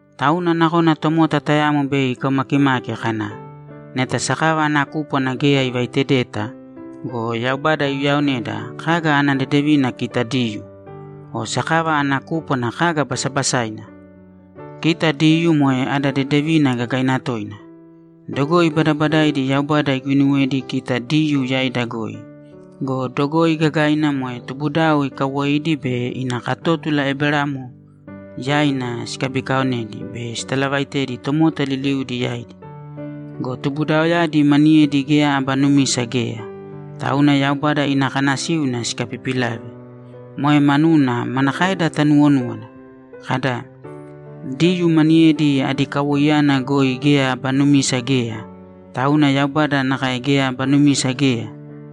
Tauna nakona tomota tayamo bei ikaumakimaki kana, ‘Neta sakava ana kúpwana geya ivaitedeta go, Yaubada iuyaoneda, kaga ana dedevina kita Diyuu? O sakava ana kúpwana kaga basabasaina?’ Kita Diyuu moe ada dedevina gagaina toina! Dogoi badabadaidi Yaubada iguinuwedi kita Diyuu yaida goi go, dogoi gagaina moe tubudao ikawoidi bei ina katótula Eberamo yaina sikabikaonedi be sitalavaitedi tomota liliudi yaidi. Go tubudaoyadi maniyedi geya aba numisa geya, tauna Yaubada ina kanasíuna sikapipilave. Moe manuna manakaeda tanuwonúwana? Kada, ‘Diyuu maniyedi adi kawoiyana goi geya aba numisa geya, tauna Yaubada nakae geya aba numisa geya’?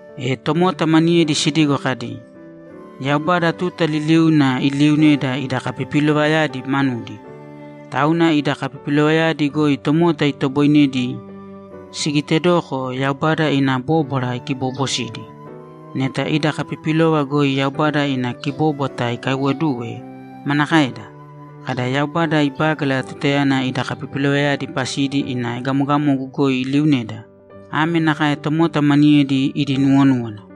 E tomota maniyedi sidigo kadi, ‘Yaubada tuta liliuna iliiuneda ida kapipilovayadi manudi. Tauna ida kapipilovayadi goi tomota itoboinedi sigitedoko Yaubada ina bóbwara ikibobosidi.’ Neta ida kapipilova goi Yaubada ina kibobwata ikaiwoduwe, manakaeda? Kada, ‘Yaubada ibágala tutayana ida kapipilovayadi pasidi ina egamogamogu goi iliuneda’? (Ame nakae tomota maniyedi idi nuwonúwana.)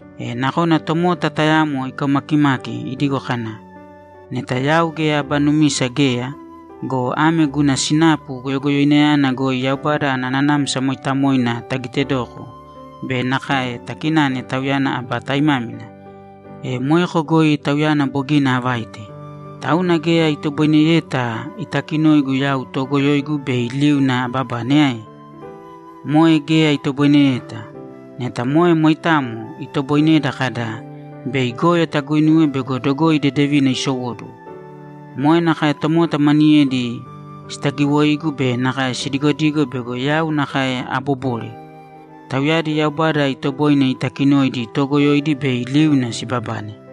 E nakona tomota tayamo ikaumakimaki idigo kana, ‘Neta yau geya aba numisa geya go, ame guna sinapu goyogoyoinayana goi Yaubada ana Nanamsa Mooitamoina tagitedoko be nakae takinane Tauyana aba taimámina, e moeko goi Tauyana bogina avaite. Tauna geya itoboineyeta itakinoigu yau toogoyoigu bei liuna ababane ae?’ Moe geya itoboineyeta! Neta moe moitamo, itoboineda kada, ‘Bei goyo taguinuwe bego dogoi dedevina isowóduwo!’ Moe nakae tomota maniyedi sitagiwoigu be nakae sidigodigo bego yau nakae aabobore. Tauyadi Yaubada itoboine itakinoidi toogoyoidi bei liuna sibabane.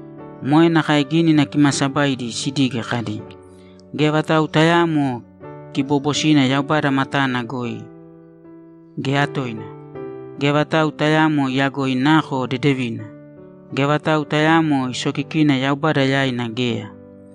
Moe nakae Gínina Kimaasabaidi sidige, kadi, ‘Geya vatau tayaamo kiboobosina Yaubada matana goi, geya toina! Geya vatau tayaamo iyagoi nako dedevina. Geya vatau tayaamo isokikina Yaubada yaina geya.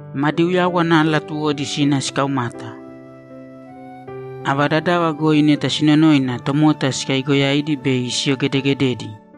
Madi uyáwana latuwodi sina sikaumata. Ava dadava goi neta sinonoina, tomota sikaigoyaidi be siyogedegededi.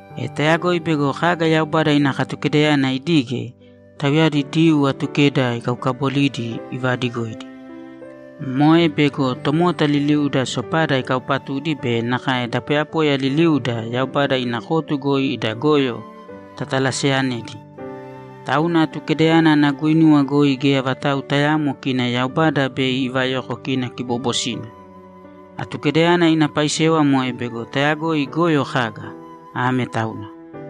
E tayagoi bego kaga Yaubada ina Katukedayana idige, tauyadi Diyuu Atukeda ikaukaabolidi ivadigoidi. Moe bego tomota liliuda sopada ikaupatudi be nakae da poyapoya liliuda Yaubada ina kotu goi ida goyo tatalaseyanedi. Tauna Atukedayana ana guinuwa goi geya vatau tayaamo kina Yaubada bei ivayoko kina kiboobosina. Atukedayana ina paisewa moe bego tayagoi goyo kaga. Ame tauna.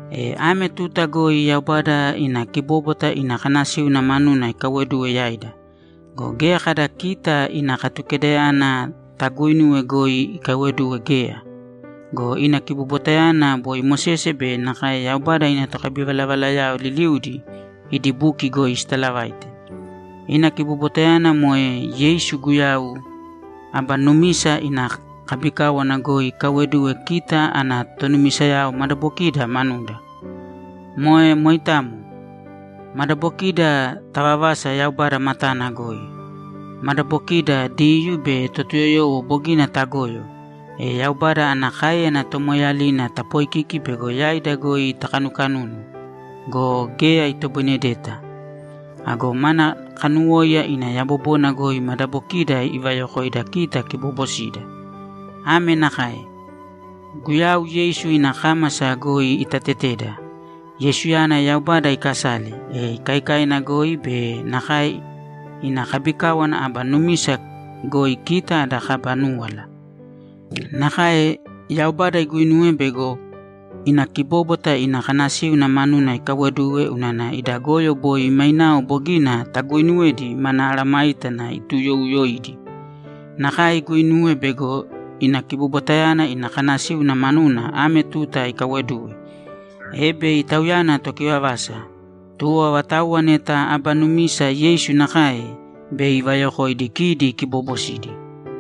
E ame tuta goi Yaubada ina kibóbwata ina kanasíuna manuna ikaiwoduwe yaida. Go geya kada kita ina Katukedayana taguuinuwe goi ikaiwoduwe geya. (Go ina kibobwatayana boi Mosese be nakae Yaubada ina tokabivalavalayao liliudi idi buki goi sitalavaite). Ina kibobwatayana moe Yeisu Guyau aba numisa ina kabikáwana goi ikaiwoduwe kita ana tonumisayao madabokida manuda. Moe moitamo. Madabokida tavavasa Yaubada matana goi. Madabokiida, Diyuu be Totuyoyowo, bogina tagoyo, e Yaubada ana káeyana tomoeeyalina tapoikiki bego yaida goi itakanukanunu go, geya itoboinedeta. Ago mana kanuwóiya ina yabobona goi madabokiida ivayokoida kita kiboobosida. Ame nakae: Guyau Yeisu ina kámasa goi itateteda. Yeisuyana Yaubada ikasale, e ikaikaina goi be nakae ina kabikáwana aba numisa goi kita ada kaba núwala. Nakae Yaubada iguinuwe bego ina kibóbwata ina kanasíuna manuna ikaiwoduwe unana ida goyo boi mainao bogina taguuinuwedi mana mesayágana ituuyouyoidi. Nakae iguinuwe bego ina kibobwatayana ina kanasíuna manuna ame tuta ikaiwoduwe, e bei Tauyana tokivavasa, tuwo avatauwa neta aba numisa Yeisu nakae, bei ivayokoidi kidi kiboobosidi.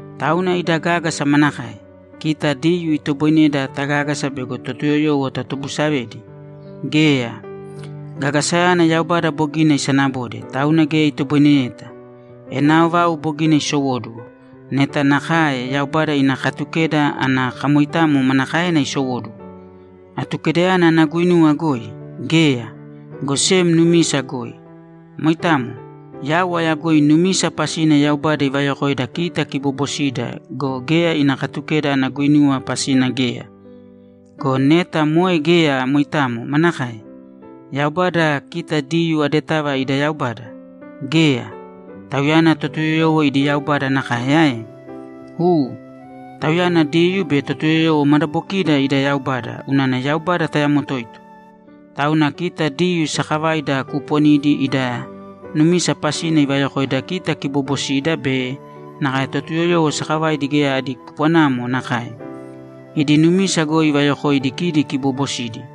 Tauna ida gágasa manakae? Kita Diyuu itoboineda tagágasa bego Totuyoyowo tatobusavedi? Geya! Gagasayana Yaubada bogina isanabode, tauna geya itoboineyeta. Enao vau bogina isowóduwo. Neta nakae, Yaubada ina Katukeda ana kamoitamo manakaena isowóduwo? Atukedayana ana guinuwa goi? Geya, go sem numisa goi. Moitamo. Yau ayagoi numisa pasina Yaubada ivayokoida kita kiboobosida go, geya ina Katukeda ana guinuwa pasina geya. Go neta moe geya moitamo, manakae? Yaubada kita Diyuu adetava ida Yaubada? Geya! Tauyana Totuyoyowo idi Yaubada nakae ae? U. Tauyana Diyuu be Totuyoyowo madabokida ida Yaubada unana Yaubada tayamo toito. Tauna kita Diyuu sakavaida kuuponidi ida numisa pasina ivayokoida kita kiboobosida be nakae Totuyoyowo sakavaidi geya adi kupwanamo nakae; idi numisa goi ivayokoidi kidi kiboobosidi.